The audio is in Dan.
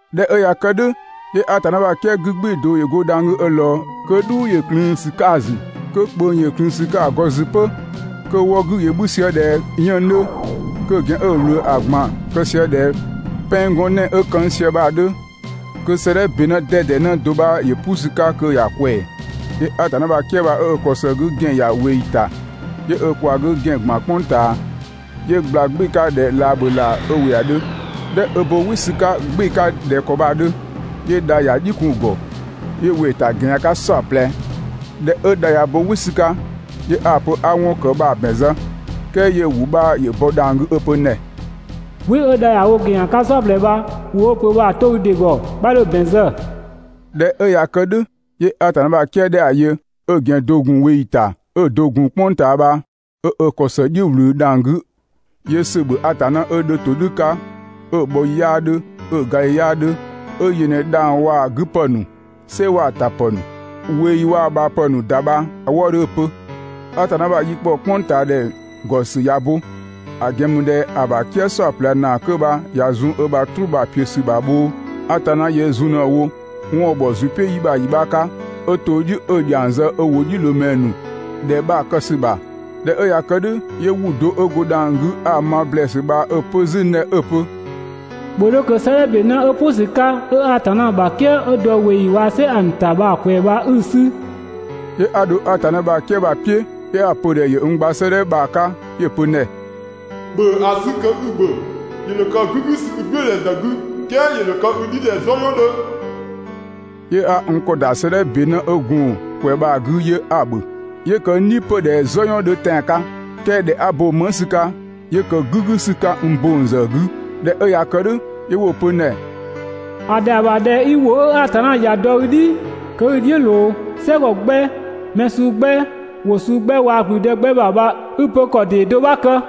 ꞊Dhɛ 'ö ꞊ya kë "dhʋ̈, 'yö Atanna ‑bha "kië 'gü "gbɩɩ‑ do ‑yö go dhang‑ 'gü 'ö ꞊lɔɔ, kö "dhuu ‑yö ꞊klëën ‑sü 'ka‑ ‑zü, kö ꞊kpöng ‑yö ꞊klëën ‑sü 'ka‑ ‑gɔ ‑zü 'pö, kö‑ wɔ 'gü ‑yö 'bhü sië ꞊dhɛ 'yënng‑ 'dhö, kö‑ ‑gɛn 'ö‑ ꞊wlöö ‑a ꞊gban‑ kë sië ꞊dhɛ pɛng gɔn 'nɛɛ‑ 'ö këng ꞊sië 'dhö. Kö 'sëëdhɛ ‑be 'në 'dɛdɛ 'në do 'bha ‑yö "pʋ ‑sü 'ka kö ‑ya ꞊kwɛɛ‑. 'Yö Atanna ‑bha "kië bha 'ö ö ‑kɔ ‑së 'gü ‑gɛn ‑ya ꞊weeyi ‑ta, 'yö ö ꞊kwaa 'gü ‑gɛn ‑gban "kpʋng ꞊taa. 'Yö ꞊gbla "gbɩɩ‑ 'ka ꞊dhɛ laabhölaa 'ö ‑wɩ ‑a 'dhö. ꞊Dhɛ 'ö bo "wɩ ‑sü 'ka "gbɩɩ‑ 'ka ꞊dhɛ ‑kɔ bha‑ 'dhö, 'yö dha ‑ya "dhiʋ̈ kun‑ ‑gɔ, 'yö ‑wɩ ‑ta ‑gɛn ‑yan 'ka "saɔplɛ. ꞊Dhɛ 'ö dha ‑yö bo "wɩ ‑sü 'ka, 'yö 'a‑ pö 'a 'wɔn 'ö ‑kë bha‑ ‑bɛn zë, "kɛɛ 'yö ‑wʋ do 'bha ‑yö bɔ dhang‑ 'gü 'ö‑ pö n ‑dhɛ: «"Wɩ 'ö dha ‑ya wo ‑gɛn ‑yan 'ka "saɔplɛ bha ‑wʋ 'ö‑ pö bha‑ 'to i ‑dɩ ‑gɔ, 'bha 'dho‑ ‑bɛn zë.» ꞊Dhɛ 'ö ꞊ya kë "dhʋ̈, 'yö Atanna ‑bha "kië 'dhɛ 'a‑ yö, 'ö‑ ‑gɛn do‑ gun ꞊weeyi ‑ta 'ö‑ do‑ gun "kpʋng ꞊taa bha 'ö ö ‑kɔ ‑së "dhiʋ̈ ꞊wlü dhang‑ 'gü, 'Yö ‑sö ‑bhö Atanna 'ö 'dhö ‑todhʋ̈ 'ka 'ö‑ bhɔ ‑yi 'yaa 'dhö 'ö‑ ga ‑yi 'yaa 'dhö, 'ö yö ꞊në dhang‑ waa‑ 'gü ‑pë ‑nu, "sɛ waa‑ ‑tapë ‑nu, ꞊weeyi waa‑ ꞊bhaapë ‑nu ‑da bha‑ wëëdhö 'ö‑ pö: «Atanna ‑bha yi ‑kpɔ "kpʋngtaadhɛ ‑gɔ ‑sü ꞊ya bo, ‑a ‑gɛn ‑mü ꞊dhɛ ‑a ‑bha "kië "saɔplɛ ‑naa 'kö bha ‑ya zun ö ‑bha "truu bha‑ ‑piö ‑sü ‑zë ‑bha bhoo, Atanna yöö zun ꞊në‑ wo 'wɔn 'ö ‑bhɔ ‑zʋ "piʋ̈ yi 'bha ‑yi 'bha 'ka 'ö‑ to "dhiʋ̈ 'ö‑ ‑dhiang zë ö ‑wʋdhiʋ̈loomɛ ‑nu ‑dhɛ bha‑ kë ‑sü ‑bha.» ꞊Dhɛ 'ö ꞊ya kë "dhʋ̈, 'yö ‑wʋ do 'ö go dhang‑ 'gü 'a‑ ma ‑blɛɛsü bha 'ö‑ pö 'zü n ‑dhɛ 'ö‑ pö: «‑Bhö 'dho kö 'sëëdhɛ ‑be 'në 'ö "pʋ ‑sü 'ka 'ö Atanna ‑bha "kië 'ö dɔ ꞊weeyi waa‑ "sɛ ‑a ‑nu ‑ta bha‑ ꞊kwɛɛ‑ bha 'i‑ 'sü.» 'Yö 'a dho Atanna ‑bha "kië bha‑ "piʋ̈, 'yö 'a‑ pö‑ ‑dhɛ ‑yö n gba 'sëëdhɛ bha‑ 'ka. 'Yö‑ pö n ‑dhɛ: «‑Bhö ‑a 'sü kö 'i‑ ‑bhö. ‑Yö ‑dho kë "gügüsü i "gblʋ̈ʋ̈dhɛ ‑zë 'gü, "kɛɛ ‑yö ‑dho kë i "dhi ꞊dhɛ "zɔyɔn 'dhö.» 'Yö 'a n ‑kɔ ‑da 'sëëdhɛ ‑be 'në 'ö gun‑ ꞊kwɛɛ‑ bha‑ 'gü 'yö 'a‑ ‑bhö. 'Yö ‑kë n "dhi 'pö ꞊dhɛ "zɔyɔn 'dhö tɛan‑ 'ka, "kɛɛ ꞊dhɛ 'a bo‑ "mëng ‑sü 'ka, 'yö ‑kë "gügü ‑sü 'ka n ‑bong ‑zë 'gü. ꞊Dhɛ 'ö ꞊ya kë "dhʋ̈, 'yö 'wo‑ pö n ‑dhɛ: «‑A ‑dhɛa ‑bha ꞊dhɛ 'i ‑wʋ 'ö Atanna ‑ya dɔ i "dhi kö 'i‑ "dhiʋ̈ ꞊loo "sɛgɔ 'gbɛ, mɛ suu 'gbɛ, ‑wʋ suu 'gbɛ waa‑ ‑gblüdë 'gbɛ ‑bha bha 'i‑ pö ‑kɔ ‑dee do 'bha kë.»